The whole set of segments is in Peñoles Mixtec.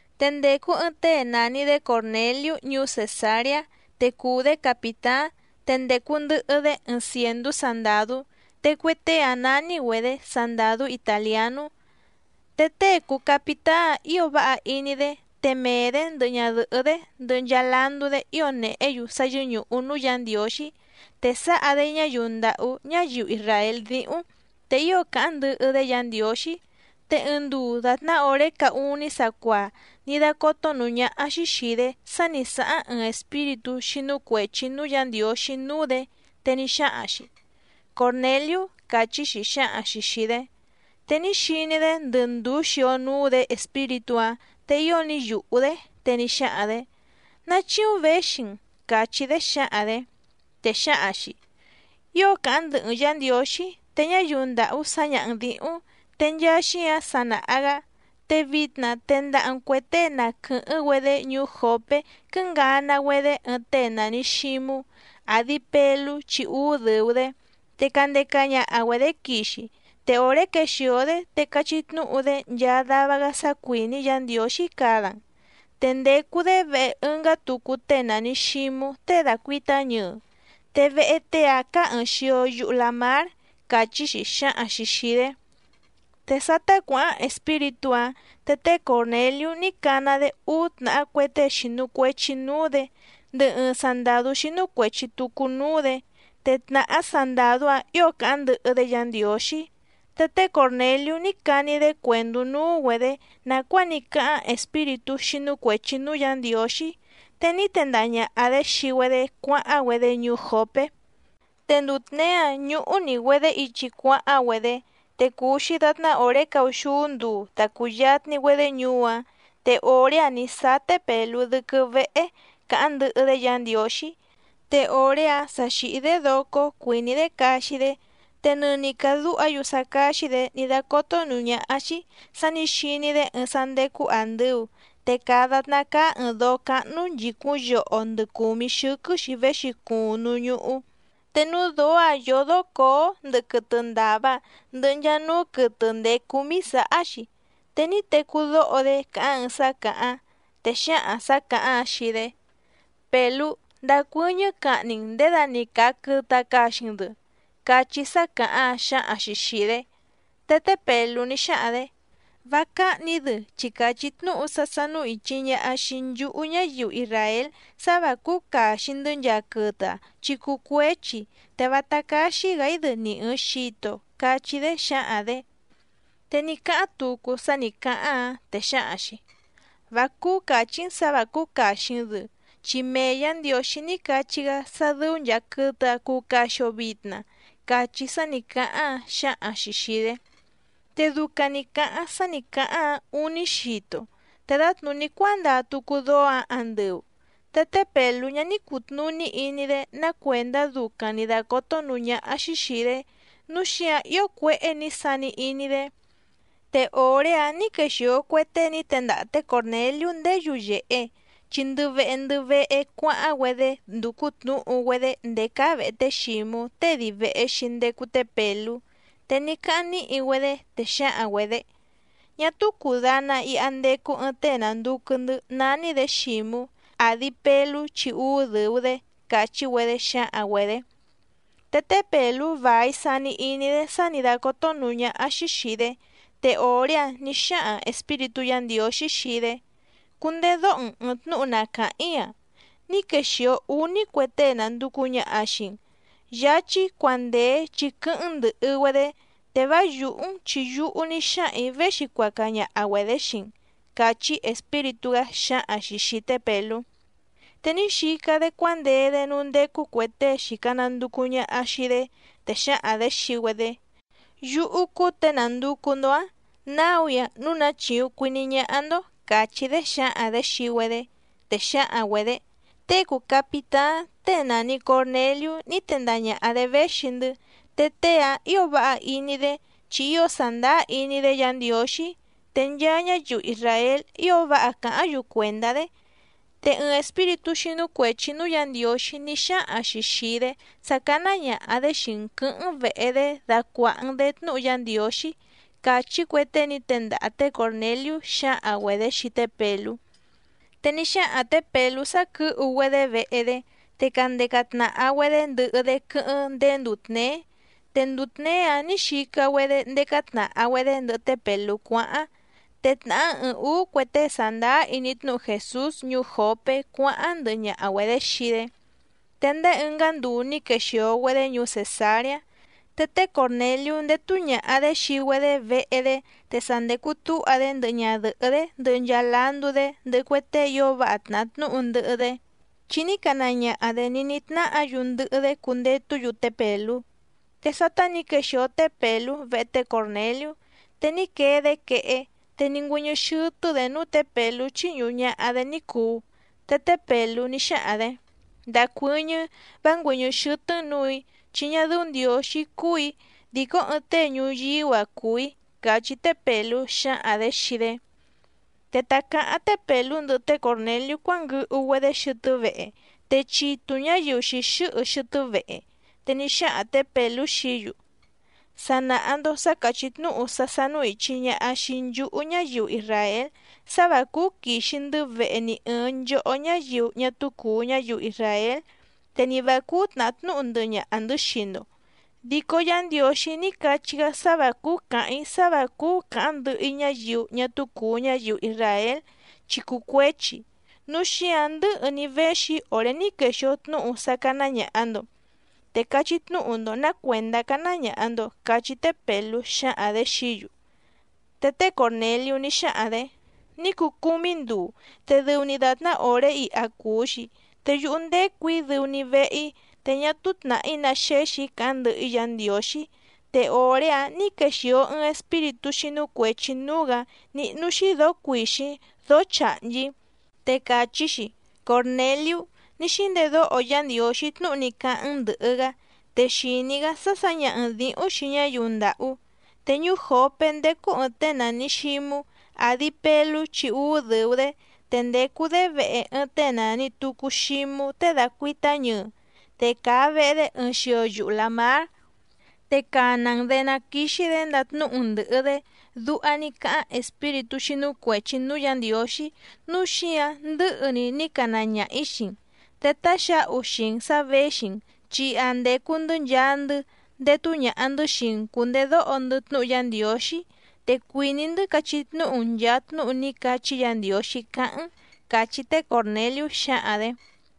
Te ndècu ɨɨⁿ tée nàni‑dé Còrneliú ñuú Cèsareá te cùu‑dé capìtáⁿ, te ndècu ndɨhɨ‑dé ɨɨⁿ cièndú sandàdú. Te cue tée‑áⁿ nání‑güedě Sandàdú Itàlianú. Te tée cùu capitáⁿ ío váha iní‑dé, te mee‑dě ndɨhɨ ñadɨ̀hɨ́‑dé ndɨhɨ nchaa landú‑dé ío nèhé‑yu sá yɨ́ñùhu núú Yǎ Ndiǒxí, te sáha‑dé ñáyiu ndàhú ñáyiu isràél díhúⁿ, te ío càháⁿ ndɨhɨ‑dé Yǎ Ndiǒxí. Te ɨɨⁿ nduu dàtná òré caá úní sacuaa ní dácótó nǔú ñáhá‑xí xìi‑dé sá ni sǎháⁿ ɨɨⁿ espíritú xínú cuèchi núú Yǎ Ndiǒxí núú‑dě, te ní xáhaⁿ‑xi: —Còrneliú —càchí‑xi xǎhaⁿ‑xi xìi‑dé. Te ní xiní‑dé ndɨ ndùú xio núú‑dě espíritú‑áⁿ. Te ío ní yùhú‑dé. Te ní xáhaⁿ‑dě: —¿Ná chíúⁿ věxi‑n? —càchí‑dé xǎhaⁿ‑dě. Te xǎhaⁿ‑xi: —Ío càháⁿ ndɨhɨ‑n Yǎ Ndiǒxí, te ñáyiu ndàhú sǎñaha‑n dǐhúⁿ‑n, te nchaa xíǎⁿ sa nàha‑gá. Te vitna tendaha‑n cuè tée na quɨ̀hɨ́ⁿ‑güedé ñuú Jòpé quɨ́ngana‑güedé ɨɨⁿ tée nàni Xímú, àdi Pelú chi úú dɨ̀u‑dé, te candeca ñaha‑güedě quixi. Te òré quexìo‑dé te cachí tnúhu‑dé nchaa dava‑gá sá cuìní Yǎ Ndiǒxí cada‑n. Te ndècu‑dé vehe ɨngá tucu tée nàni Xímú tée dàcuitá ñɨɨ, te vehe tée‑áⁿ cáá ɨ̀ɨⁿ xio yuhu lamár —càchí‑xi xáhaⁿ‑xi xìi‑dé. Te sátá cuǎháⁿ espíritú‑áⁿ, te té Còrneliú ní cana‑dé úú tnàhá cue tée xìnu cuechi núú‑dě ndɨhɨ ɨɨⁿ sandàdú xínú cuèchi tucu núú‑dě, te tnàhá sandàdú‑áⁿ ǐo càháⁿ ndɨhɨ‑dé Yǎ Ndiǒxí. Te té Còrneliú ní cani‑dé cuèndú núú‑güedě nàcuáa ní cáháⁿ espíritú xínú cuèchi núú Yǎ Ndiǒxí. Te ní tendaha ñàha‑dé xii‑güedé cuáháⁿ‑güedé ñuú Jòpé. Te nduu tněé‑áⁿ ñúhú‑ní‑güedě ichi cuáháⁿ‑güedé, te cùu‑xi datná òré caúxúú nduu ta cùyatni‑güedé ñuú‑áⁿ, te òré‑áⁿ nǐ sáá té Pèlú dɨ́quɨ́ véhé càháⁿ ndɨhɨ‑dé Yǎ Ndiǒxí. Te òré‑áⁿ sa xìhí‑dé docó cuìní‑dé caxi‑dé, te nɨni càdúha‑yu sá cáxí‑dě ní dácótó nǔú ñáhá‑xí sǎ nǐ xiní‑dé ɨɨⁿ sá ndécú àndɨu, te càa datná cáá ɨ̀ɨⁿ dóó cáhnú nchìcúⁿ yoho ndɨ cùmí xɨ́quɨ́‑xi véxi cuuⁿ núú ñúhú. Te núú dǒó‑ǎⁿ yódó cǒó ndɨhɨ quɨtɨ ndàva ndɨhɨ nchaa núú quɨtɨ ndèé cúmí sǎhá‑xi. Te ní tecú dóho‑dé càháⁿ ɨɨⁿ sá càháⁿ, te xǎhaⁿ sǎ càháⁿ‑áⁿ xii‑dé: —Pèlú, ndacuɨ́ñɨ́ cahni‑n nděda‑ni càa quɨtɨ‑a caxi‑n‑dɨ —cachí sá càháⁿ‑áⁿ xǎhaⁿ‑xi xìi‑dé. Te té Pèlú ní xáhaⁿ‑dě: —Vá cáhnì‑í‑dɨ chi càchí tnúhu sá sánú ìchi ñaha xii nchúhú ñáyiu isràél sá vǎ cúú càxi‑ndɨ́ nchaa quɨtɨ‑a chi cuu cuéchi, te vátá cáxí‑gǎ‑í‑dɨ ni ɨ̀ɨⁿ xito —cachí‑dé xǎhaⁿ‑dě. Te ní cáháⁿ tucu sá nǐ cáháⁿ‑áⁿ, te xǎhaⁿ‑xi: —Vá cúú càchí‑n sǎ vǎ cúú càxi‑n‑dɨ, chi mee Yǎ Ndiǒxí ní cachí‑gá sá dɨ́ú nchàa quɨtɨ‑a cuu caxi‑o vitna —cachí sá nǐ cáháⁿ‑áⁿ xǎhaⁿ‑xi xìi‑dé. Te ducaⁿ nǐ cáháⁿ sá nǐ cáháⁿ‑áⁿ ǔní xito, te dǎtnùní cuándaa tucu dóó‑ǎⁿ andɨu. Te té Pèlú ñá ní cùtnuní iní‑dé ná cuèndá ducaⁿ nǐ dácótó nǔú ñáhá‑xí xìi‑dé, núu xíǎⁿ ío cuéhé nǐ sani iní‑dé. Te òré‑áⁿ nǐ quexìo cue tée ní tendaha té Còrneliú ndéé yuyèhe, chi ndɨ vehe ndɨ vehe cuáháⁿ‑güedé ndúcú tnǔhu‑güedé ndèé cáá vèhe té Xǐmú tée dii vèhe‑xi ndecu té Pèlú. Te ní cáháⁿ níhi‑güedé, te xǎhaⁿ‑güedě: —Ñá túú cùdana iha ndecu ɨɨⁿ tée nànducu‑ndɨ́ nání‑dě Xǐmú, àdi Pelú chi úú dɨ̀u‑dé —càchí‑güedé xǎhaⁿ‑güedě. Te té Pèlú vài sani iní‑dé sá nǐ dácótó nǔú ñáhá‑xí xìi‑dé. Te òré‑áⁿ nǐ xáhaⁿ Espíritú Yǎ Ndiǒxí xii‑dé: —Cundedóho‑n ɨ̀ɨⁿ tnúhu na càháⁿ‑í‑a. Ní quexìo úní cue tée nànducu ñaha xii‑n. Yáchí, cuandèe chi quɨ́hɨ́ⁿ‑n ndɨ̀hɨ‑güedé, te vá yùhú‑n chi yúhú ní xáhaⁿ‑ǐ véxi cuaca ñaha‑güedě xii‑n —càchí Espíritú‑gá xǎhaⁿ‑xi xìi té Pèlú. Te ní xica‑dé cuándee‑dé núú ndécú cuè tée xìca nanducu ñaha xii‑dé, te xǎhaⁿ‑dě xii‑güedé: —Yúhú cúú těe nànducu‑ndo‑áⁿ. Náu‑í‑a núu ná chíúⁿ cuìní ñáhá‑ndó —càchí‑dé xǎhaⁿ‑dě xii‑güedé. Te xǎhaⁿ‑güedě: —Tée cùu capitáⁿ tée nàni Corneliú ní tendaha ñàha‑dé véxi‑ndɨ́, te tée‑áⁿ ǐo váha iní‑dé, chi ío sàndáá iní‑dé Yǎ Ndiǒxí, te nchaa ñáyiu isràél ío váha càháⁿ‑yu cuèndá‑dé. Te ɨɨⁿ espíritú xínú cuèchi núú Yǎ Ndiǒxí ní xáhaⁿ‑xi xìi‑dé sá cáná ñàha‑dé xii‑n quɨ̌hɨ́ⁿ‑n vèhe‑dé dacuàha‑n‑dé tnúhu Yá Ndiǒxí —càchí cue tée ní tendaha té Còrneliú xǎhaⁿ‑güedě xii té Pèlú. Te ní xáhaⁿ tě Pèlú sá quɨ̌hu‑güedé vehe‑dé, te candeca tnàha‑güedé ndɨhɨ‑dé quɨ́hɨ́ⁿ ndéé nduu tněé. Te nduu tněé‑áⁿ nǐ xica‑güedé ndécá tnàha‑güedé ndɨhɨ té Pèlú cuáháⁿ, te tnàhá ɨɨⁿ ǔú cue tée sàndáá iní tnúhu Jèsús ñuú Jòpé cuáháⁿ ndɨhɨ ñaha‑güedě xii‑dé. Te ndéé ɨngá nduu ní quexìo‑güedé ñuú Cèsareá. Te té Còrneliú ndétú ñàha‑dé xii‑güedé vehe‑dé te sa ndècu túha‑dé ndɨhɨ ñadɨ̀hɨ́‑dé ndɨhɨ nchaa landú‑dé ndɨhɨ cue tée ío váha tnàhá tnúhu ndɨhɨ‑dé, chi ní cana ñaha‑dě ní nítnáhǎ‑yu ndɨhɨ‑dé cundetú‑yu té Pèlú. Te sátá nǐ quèxio té Pèlú vehe té Còrneliú, te ní quee‑dé quehé, te ní ngüɨ́ñɨ́ xɨ́tɨ́‑dě núú tě Pèlú chíñùhu ñaha‑dé ní cùu. Te té Pèlú ní xáhaⁿ‑dě: —Ndacuɨ́ñɨ́ vá ngüɨ̀ñɨ́ xɨ́tɨ́‑n nǔù‑í chi ñá dɨ́ú Ndiǒxí cúù‑í, dìcó ɨɨⁿ tée ñuyíú‑a cùu‑í —càchí té Pèlú xǎhaⁿ‑dě xii‑dé. Te ta cǎháⁿ té Pèlú ndɨhɨ té Còrneliú cuánguɨhu‑güedé xɨtɨ́ vehe, te chitu ñǎyiu xìxɨ́hɨ xɨtɨ́ vehe. Te ní xáhaⁿ tě Pèlú xií‑yu: —Sa nàha‑ndo sá càchí tnúhu sá sánú ìchi ñaha xii nchúhú ñáyiu isràél sá vǎ cúú quìxi‑ndɨ́ vehe ni ɨ̀ɨⁿ nchohó ñáyiu ñá túú cùu ñáyiu isràél te ni vǎ cúú tnàhá tnúhu ndɨhɨ ñaha‑ndɨ̌ xii‑ndo. Dico Yá Ndiǒxí ní cachí‑gá sá vǎ cúú cǎháⁿ‑í sá vǎ cúú cǎháⁿ ndɨhɨ‑í ñáyiu ñá túú cùu ñáyiu isràél, chi cuu cuéchi. Núu xíǎⁿ ndɨ̌hɨ‑ni véxi‑í òré ní quexìo tnúhu sá cáná ñàha‑ndo. Te cachí tnúhu‑ndo nǎ cuèndá cáná ñàha‑ndo —cachí té Pèlú xǎhaⁿ‑dě xií‑yu. Te té Còrneliú ní xáhaⁿ‑dě: —Ní cuu cúmí nduu, te dɨu‑ni dàtná òré iha cùu‑xi, te yúhú ndècu‑í dɨu‑ni vehe‑í, te ñá túú tnàhí ná xéxì‑í cáháⁿ ndɨhɨ‑í Yǎ Ndiǒxí, te òré‑áⁿ nǐ quexìo ɨɨⁿ espíritú xínú cuèchi núú‑gǎ níhnú‑xí dǒó cuìxíⁿ dóó chàhnchí. Te càchí‑xi: “Còrneliú, ní xíndedóho Yá Ndiǒxí tnúhu ní cáháⁿ‑n ndɨ̀hɨ‑gá, te xìní‑gá sá sǎñaha‑n dǐhúⁿ xii ñáyiu ndàhú. Te ñuú Jòpé ndécú ɨ̀ɨⁿ tée nàni Xímú, àdi Pelú chi úú dɨ̀u‑dé, te ndècu‑dé vehe ɨɨⁿ tée nàni tucu Xímú tée dàcuitá ñɨɨ, te càa vehe‑dé ɨɨⁿ xio yuhu làmár, te cana‑n‑dě ná quìxi‑dé ndatnúhu‑n ndɨ̀hɨ‑dé”, duha ní cáháⁿ espíritú xínú cuèchi núú Yǎ Ndiǒxí. Núu xíǎⁿ ndɨ̌hɨ‑ni ní cana ñaha‑ǐ xii‑n. Te táxǎhu xii‑n sǎ věxi‑n chi iha ndècu‑ndɨ́ nchaa‑ndɨ́ ndétú ñàha‑ndɨ́ xii‑n cùndedóho‑ndɨ́ tnúhu Yá Ndiǒxí, te cuìní‑ndɨ́ cachí tnúhu‑n nchàa tnúhu ní cachí Yǎ Ndiǒxí cáháⁿ‑n —càchí té Còrneliú xǎhaⁿ‑dě.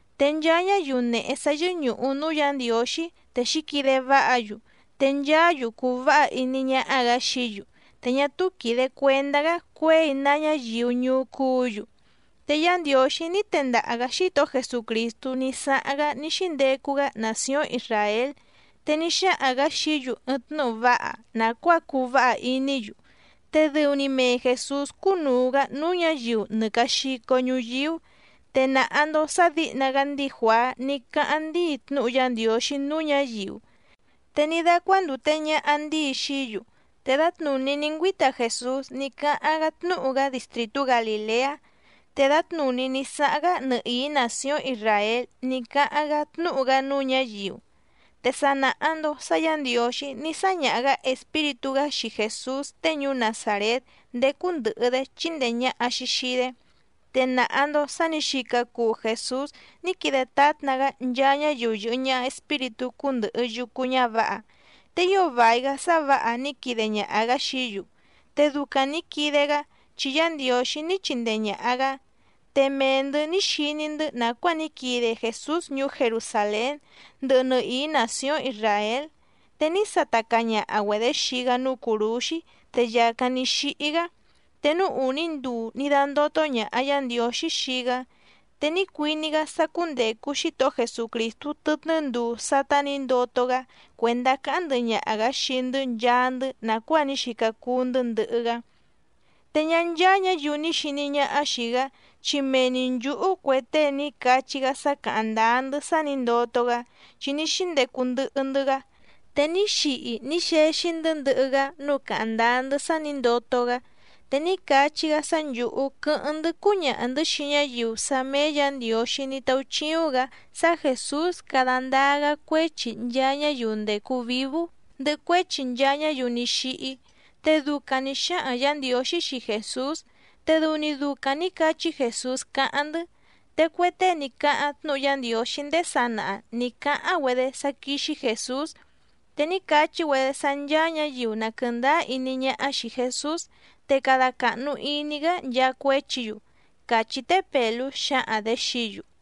Te nchaa ñáyiu nèhe sá yɨ́ñùhu núú Yǎ Ndiǒxí, te xǐquide váha‑yu, te nchaá‑yu cùu váha iní ñáhá‑gǎ xií‑yu. Te ñá túú quìde cuendá‑gá cuěi ná ñáyiu ñuú cúǔ‑yu. Te Yá Ndiǒxí ní tendaha‑gǎ Xítohó Jesucrìstú ní sáháⁿ‑gá ní xíndecu‑gá nàcióⁿ Isràél, te ní xáhaⁿ‑gǎ xií‑yu ɨɨⁿ tnúhu váha nàcuáa cuu váha iní‑yu. Te dɨu‑ni mee Jèsús cúnùu‑gá núú ñǎyiu nɨ càa xico ñuyíú. Te nàha‑ndo sá dǐhna‑gá ndíi Juàá ní cáháⁿ ndíi tnúhu Yá Ndiǒxí núú ñǎyiu, te ní dácuándùte ñaha ndíi xií‑yu. Te dǎtnùní ní ngüíta Jèsús ní cáháⁿ‑gá tnúhu‑gá distrìtú Galìleá, te dǎtnùní ní sáháⁿ‑gá nɨhìí nàcióⁿ Isràél ní cáháⁿ‑gá tnúhu‑gá núú ñǎyiu. Te sa nàha‑ndo sá Yǎ Ndiǒxí ní sáñaha‑gǎ Espíritú‑gá xii Jèsús tée ñuú Nazàrét ndécú ndɨ̀hɨ‑dé chíndèe ñaha‑xi xii‑dé. Te nàha‑ndo sá nǐ xica cuu Jèsús ní quide tátna‑gá nchaa ñáyiu yɨ̀hɨ ñaha espíritú cúndɨ̀hɨ yucu ñávǎha. Te ío vài‑gá sá vǎha ní quide ñaha‑gǎ xií‑yu, te ducaⁿ nǐ quide‑gá, chi Yá Ndiǒxí ní chindee ñàha‑gá. Te mee‑ndɨ̌ ní xiní‑ndɨ́ nàcuáa ní quide Jèsús ñuú Jerusàlén ndɨhɨ nɨhìí nàcióⁿ Isràél. Te ní sata caa ñaha‑güedě xii‑gá núú cùrúxí te yàcáⁿ ní xíhí‑gá. Te núú ùní nduu ní dándótó ñàha Yá Ndiǒxí xii‑gá. Te ní cuiní‑gá sá cúndècu Xítohó Jesucrìstú tɨtnɨ́ nduu sátá nǐ ndoto‑gá cuèndá cáháⁿ ndɨhɨ ñaha‑gǎ xii‑ndɨ́ nchaa‑ndɨ́ nàcuáa ní xica cuu‑ndɨ́ ndɨhɨ‑gá. Te ñá ncháá ñǎyiu ni xìní ñáhá xìi‑gá, chi mee‑ni nchǔhú cue tée ní cachí‑gá sá càháⁿ ndáá‑ndɨ́ sá nǐ ndoto‑gá, chi ní xíndecu ndɨhɨ‑ndɨ́‑gá, te ní xihi ní xexi‑ndɨ́ ndɨhɨ‑gá, núu càháⁿ ndáá‑ndɨ́ sá nǐ ndoto‑gá. Te ní cachí‑gá sá nchǔhú quɨ́hɨ́ⁿ‑ndɨ́ cúñaha‑ndɨ̌ xii ñáyiu sá méé Yǎ Ndiǒxí ní táúchíúⁿ‑gǎ sá Jèsús cada ndáá‑gá cuéchi nchaa ñáyiu ndècu vívú ndɨhɨ cuéchi nchaa ñáyiu ní xíhí. Te ducaⁿ nì xáhaⁿ Yǎ Ndiǒxí xii Jèsús, te dɨu‑ni ducaⁿ nǐ cachí Jèsús cáháⁿ‑ndɨ́. Te cue tée ní cáháⁿ tnúhu Yá Ndiǒxí ndéé sanaha nǐ cáháⁿ‑güedé sá quíxí Jèsús, te ní cachí‑güedé sá ncháá ñǎyiu na quɨ̀ndáá iní ñáhá xìi Jesús, te cada càhnu iní‑gá nchaa cuéchi‑yu —càchí té Pèlú xǎhaⁿ‑dě xií‑yu.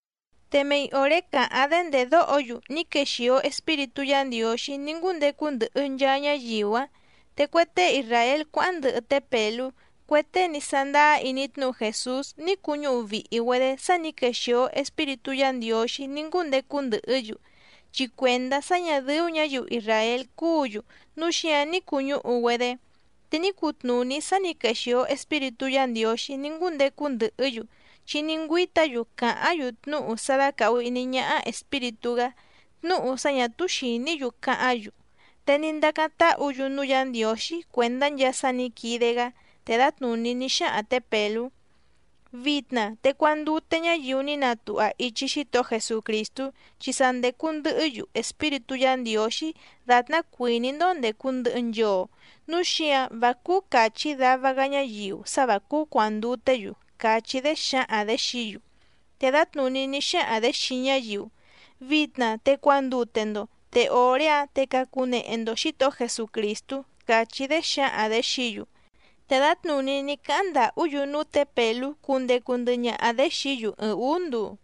Te mei òré càháⁿ‑dé ndèdóho‑yu ní quexìo Espíritú Yǎ Ndiǒxí ní ngúndecu ndɨhɨ nchaa ñáyiu‑áⁿ. Te cue tée isràél cuáháⁿ ndɨhɨ té Pèlú, cue tée ní sándáá iní tnúhu Jèsús ní cuñúhu vìhi‑güedé sá nǐ quexìo Espíritú Yǎ Ndiǒxí ní ngúndecu ndɨhɨ́‑yu, chi cuèndá sá ñà dɨ́ú ñǎyiu isràél cúǔ‑yu núu xíǎⁿ ní cuñúhu‑güedé. Te ní cutnùní sá nǐ quexìo Espíritú Yǎ Ndiǒxí ní ngúndecu ndɨhɨ́‑yu, chi ní ngüíta‑yu càháⁿ‑yu tnúhu sá dácàhu iní ñáhá Espíritú‑gá, tnúhu sá ñà túú xìní‑yu cáháⁿ‑yu. Te ní ndacáⁿ táhǔ‑yu núú Yǎ Ndiǒxí cuèndá nchaa sá nǐ quide‑gá. Te dǎtnùní ní xáhaⁿ tě Pèlú: —Vitna te cuandute ñáyiu ní natuha ichi Xítohó Jesucrìstú chi sa ndècu ndɨhɨ́‑yu Espíritú Yǎ Ndiǒxí dàtná cuìní‑ndó ndècu ndɨhɨ nchoo, núu xíǎⁿ vá cúú càchí dava‑gá ñáyiu sá vǎ cúú cuànduté‑yu —càchí‑dé xǎhaⁿ‑dě xií‑yu. Te dǎtnùní ní xáhaⁿ‑dě xii ñáyiu: —Vitna te cuandute‑ndo, te òré‑áⁿ te cacunehe‑ndo Xǐtohó Jesucrìstú —càchí‑dé xǎhaⁿ‑dě xií‑yu. Te dǎtnùní ní cáháⁿ ndàhú‑yu núú tě Pèlú cundecu ndɨhɨ ñaha‑dě xií‑yu ɨɨⁿ ǔú nduu.